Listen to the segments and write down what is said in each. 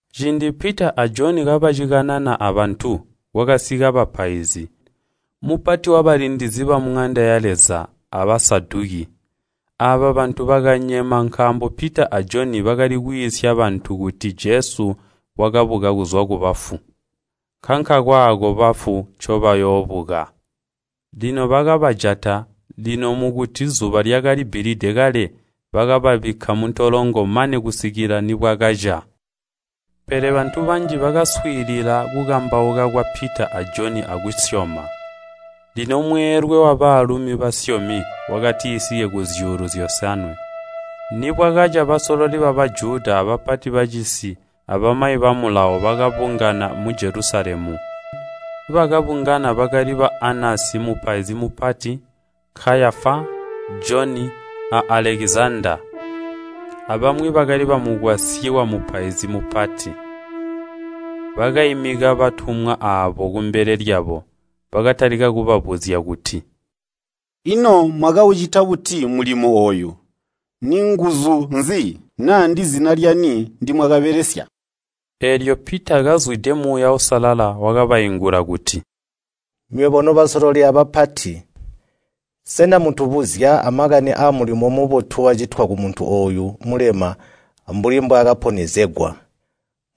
Ciindi Pita a Joni kabacikanana abantu kwakasika bapaizi, mupati wabalindizi bamuŋanda ya Leza, a Basaduki. Aaba bantu bakanyema nkaambo Pita a Joni bakali kwiisya bantu kuti Jesu wakabuka kuzwa kubafu, nkankakaako bafu ncoobayoobuka. Lino bakabajata, lino mukuti zuba lyakalibbilide kale bakababikka muntolongo mane kusikila nibwakaca. Pele bantu banji bakaswiilila kukambauka kwa Pita a Joni akuzumina. Lino mweelwe wabaalumi basyomi wakatisike kuzyuulu zyosanwe. Nibwakaca basololi ba Bajuda, bapati bacisi, abamayi ba Mulawo bakabungana mu Jelusalemu. Bakabungana bakali ba Anasi mupaizi mupati, Kayafa, Joni, a Alekizandaa, abamwi bakali bamukwasyi wamupaizi mupati. Bakaimika batumwa aabo kumbele lyabo, bakatalika kubabuzya kuti, “Ino mwakaucita buti mulimo ooyu? Ninguzu nzi, naa ndizina lyani ndimwakabelesya?” Eelyo Pita, kazwide Muuya Uusalala, wakabaingula kuti, “Nywebo nobasololi abapati, sena mutubuzya amakani aamulimo mubotu wakacitwa kumuntu ooyu mulema ambuli mbwaakaponyezegwa?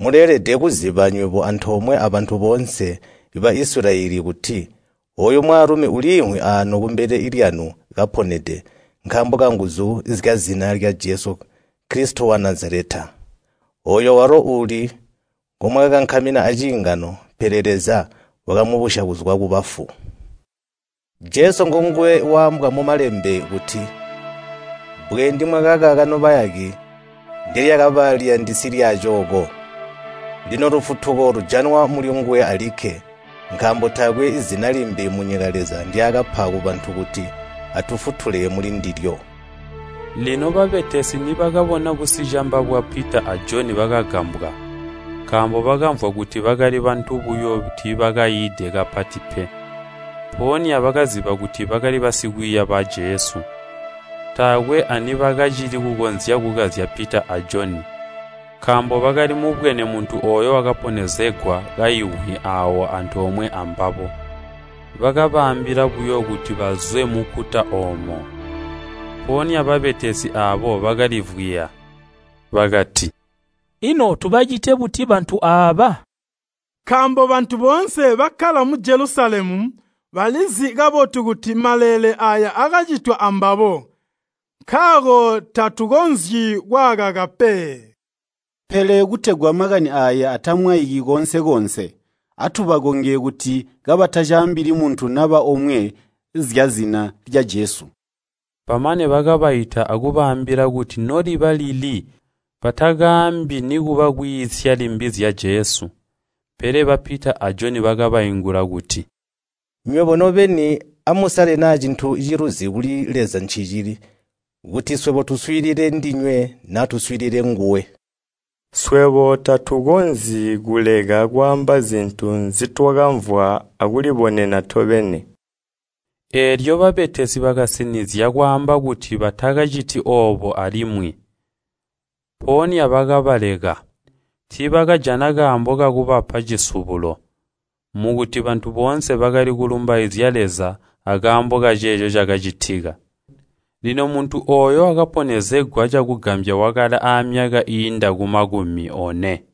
Muleelede kuziba nywebo antoomwe abantu boonse ba Isilayeli kuti, ooyu mwaalumi uliimvwi aano kumbele lyanu kaponede nkaambo kanguzu zyazina lya Jesu Kilisito wa Nazaleta. Ooyo walo uuli ngomwakakankamina aciingano, pele Leza wakamubusya kuzwa kubafu. Jesu ngonguwe waambwa mu Malembe kuti, ‘Bbwe ndimwakakaka nobayaki, ndelyakaba liyandisi lyaacooko.’ Lino lufutuko lujanwa mulinguwe alikke, nkaambo taakwe zina limbi munyika Leza ndyaakapa kubantu kuti atufutulile mulindilyo.” Lino babetesi nibakabona busicamba bwa Pita a Joni bakagambwa, nkaambo bakamvwa kuti bakali bantu buyo tiibakaiide kapati pe. Mpoonya bakaziba kuti bakali basikwiiya ba Jesu. Taakwe anibakacili kukonzya kukazya Pita a Joni, nkaambo bakali mubwene muntu ooyo wakaponyezegwa kaimvwi aawo antoomwe ambabo. Bakabaambila buyo kuti bazwe munkuta oomo. Mpoonya babetesi aabo bakalivwiya. Bakati, “Ino tubacite buti bantu aaba? Nkaambo bantu boonse bakkala mu Jelusalemu balizi kabotu kuti maleele aaya akacitwa ambabo, nkaako tatukonzyi kwaakaka pe. Pele kutegwa makani aaya atamwaiki koonse-koonse, atubakonge kuti kabatacaambili muntu naba omwe zyazina lya Jesu.” Bamane bakabaita akubaambila kuti noliba lili batakaambi nikuba kwiisya limbi zya Jesu. Pele ba Pita a Joni bakabaingula kuti, “Nywebo nobeni, amusale naa cintu ciluzi kuli Leza ncicili, kuti swebo tuswiilile ndinywe naa tuswiilile nguwe. Swebo tatukonzyi kuleka kwaamba zintu nzitwakamvwa akulibonena tobeni.” Eelyo babetesi bakasinizya kwaamba kuti batakaciti oobo alimwi, mpoonya bakabaleka. Tiibakajana kaambo kakubapa cisubulo, mukuti bantu boonse bakali kulumbaizya Leza akaambo kaceeco cakacitika. Lino muntu ooyo wakaponyezegwa cakugambya wakalaamyaka iiinda kumakumi one.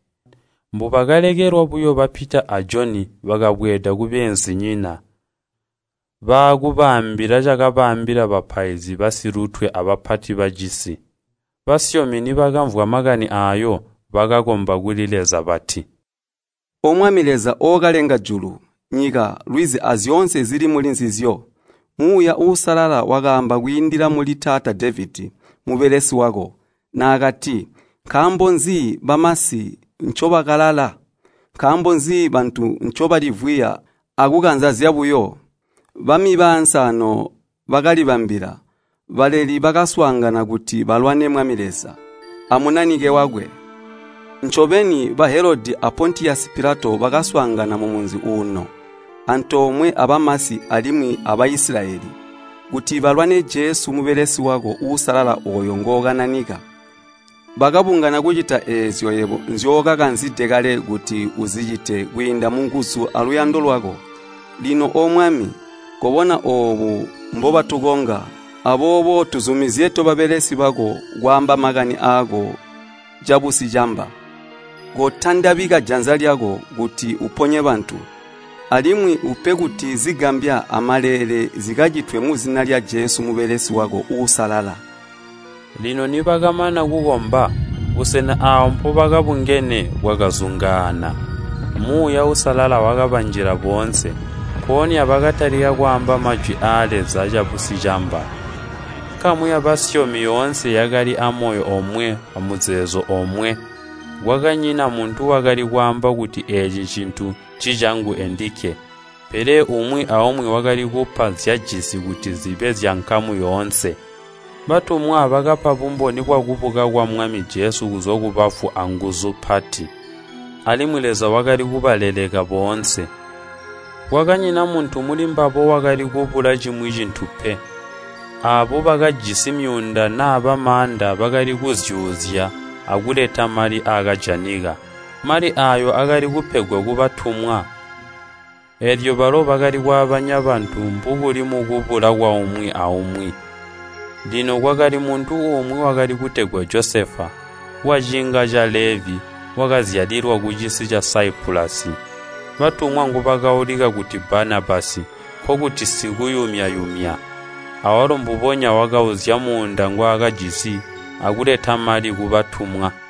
Mbubakalekelwa buyo ba Pita a Joni bakabweeda kubeenzinyina, baakubaambila cakabaambila bapaizi basilutwe abapati bacisi. Basyomi nibakamvwa makani aayo, bakakomba kuli Leza bati, “O Mwami Leza Ookalenga julu, nyika, lwizi, azyoonse zili mulinzizyo! Kwiindila mu Muuya Uusalala wakaamba kuli taata Devedi mubelesi wako, naakati, ‘Nkaambo nzi bamasi ncobakalala? Nkaambo nzi bantu ncobalivwiya akukanza zyabuyo? Bami baansi aano bakalibambila, baleli bakaswaangana kuti balwane Mwami Leza, a Munanike wakwe.’ Ncobeni, ba Helodi a Pontiyosi Pilato bakaswaangana mumunzi uuno, antoomwe abamasi alimwi a Baisilayeli, kuti balwane Jesu mubelesi wako uusalala ooyo ngookananika. Bakabungana kucita eezyo yebo nzyookakanzide kale kuti uzicite kwiindila munguzu aluyando lwako. Lino O Mwami, kobona oobu mbobatukonga, aboobo tuzumizye tobabelesi bako, kwaamba makani aako cabusicamba. Kotandabika janza lyako kuti uponye bantu, alimwi upe kuti zigambya amaleele zikacitwe muzina lya Jesu mubelesi wako uusalala.” Lino nibakamana kukomba, busena aawo mpobakabungene bwakazungaana. Muuya Uusalala wakabanjila boonse, mpoonya bakatalika kwaamba majwi aa Leza cabusicamba. Nkamu yabasyomi yoonse yakali amoyo omwe amuzeezo omwe. Kwakanyina muntu wakali kwaamba kuti eeci cintu ncicangu endikke, pele umwi aumwi wakali kupa nzyajisi kuti zibe zyankamu yoonse. Batumwa bakapa bumboni bwakubuka kwa Mwami Jesu kuzwa kubafu anguzu mpati, alimwi Leza wakali kubaleleka boonse. Kwakanyina muntu mulimbabo wakali kubula cimwi cintu pe. Aabo bakajisi myuunda naaba maanda bakali kuzyuuzya akuleta mali aakajanika. Mali aayo akali kupegwa kubatumwa, eelyo balo bakali kwaabanya bantu, mbubuli mukubula kwaumwi aumwi. Lino kwakali muntu umwi, wakali kutegwa Josefa, waciinga ca Levi wakazyalilwa kucisi ca Saipulasi, batumwa ngubakaulika kuti Banabasi, (nkokuti “Sikuyumya-yumya”). Awalo mbubonya wakauzya muunda ngwaakajisi, akuleta mali kubatumwa.